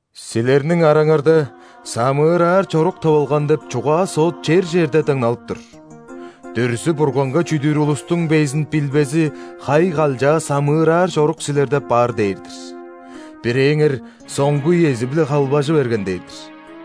Силерниң араңарда самыыраар чорук тывылган деп чугаа-соот чер-черде дыңналып тур. Дүрзү-бурганга чүдүүр улустуң безин билбези хай-калчаа самыыраар чорук силерде бар дээр-дир: бирээңер соңгу иези-биле холбажы берген дээр-дир.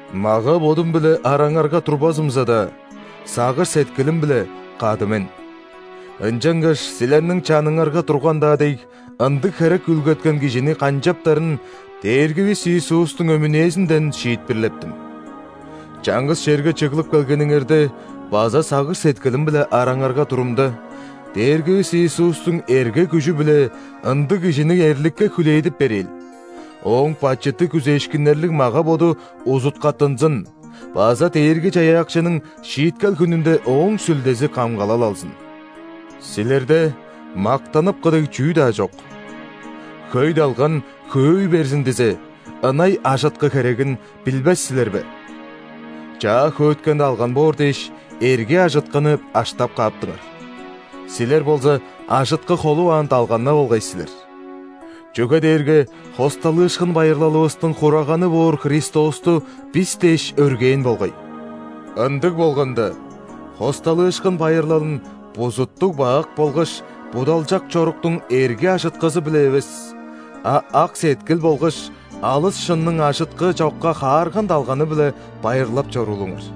Мага-бодум-биле араңарга турбазымза-даа, сагыш-сеткилим-биле – кады мен. Ынчангаш силерниң чаныңарга турган-даа дег, ындыг херек үүлгеткен кижини канчаптарын Дээргивис Иисустуң өмүнээзинден шиитпирлептим. Чаңгыс черге чыглып келгениңерде (база сагыш-сеткилим-биле араңарга турумда), Дээргивис Иисустуң эрге-күжү-биле ындыг кижини эрликке хүлээдип берээл – ооң бачыттыг күзээшкиннерлиг мага-боду узуткаттынзын база Дээрги-Чаяакчының шииткел хүнүнде ооң сүлдези камгалал алзын. Силерде мактаныпкы дег чүү-даа чок. «Хөй далган хөөй берзин дизе, ынай ажыткы херегин» билбес силер бе? Чаа хөөткен далган боор дээш, эрги ажыткыны аштап кааптыңар, силер болза ажыткы холуваан далган-на болгай силер. Чүге дээрге ·Хосталыышкын байырлалывыстың Хураганы боор Христосту бис дээш өргээн болгай. Ындыг болганда, Хосталыышкын байырлалын бузуттуг-бак болгаш будалчак чоруктуң эрги ажыткызы-биле эвес, а ак сеткил болгаш алыс шынның ажыткы чокка хаарган далганы-биле байырлап чоруулуңар.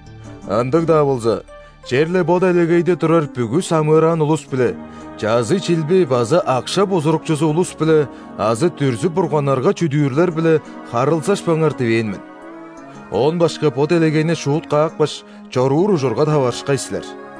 Ындыг-даа болза, черле бо делегейде турар бүгү самыыраан улус-биле, чазый-чилби база акша бузурукчузу улус-биле азы дүрзү-бурганнарга чүдүүрлер-биле харылзашпаңар дивээн мен. Оон башка бо делегейни шуут каапкаш, чоруур ужурга таварышкай силер.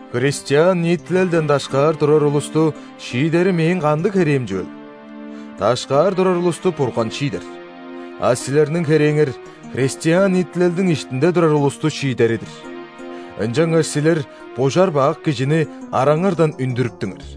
Христиан ниитилелден дашкаар турар улусту шиидери мээң кандыг херээм чүвел? Дашкаар турар улусту Бурган шиидер, а силерниң херээңер – христиан ниитилелдиң иштинде турар улусту шиидери-дир. Ынчангаш силер бужар-бак кижини араңардан үндүрүптүңер.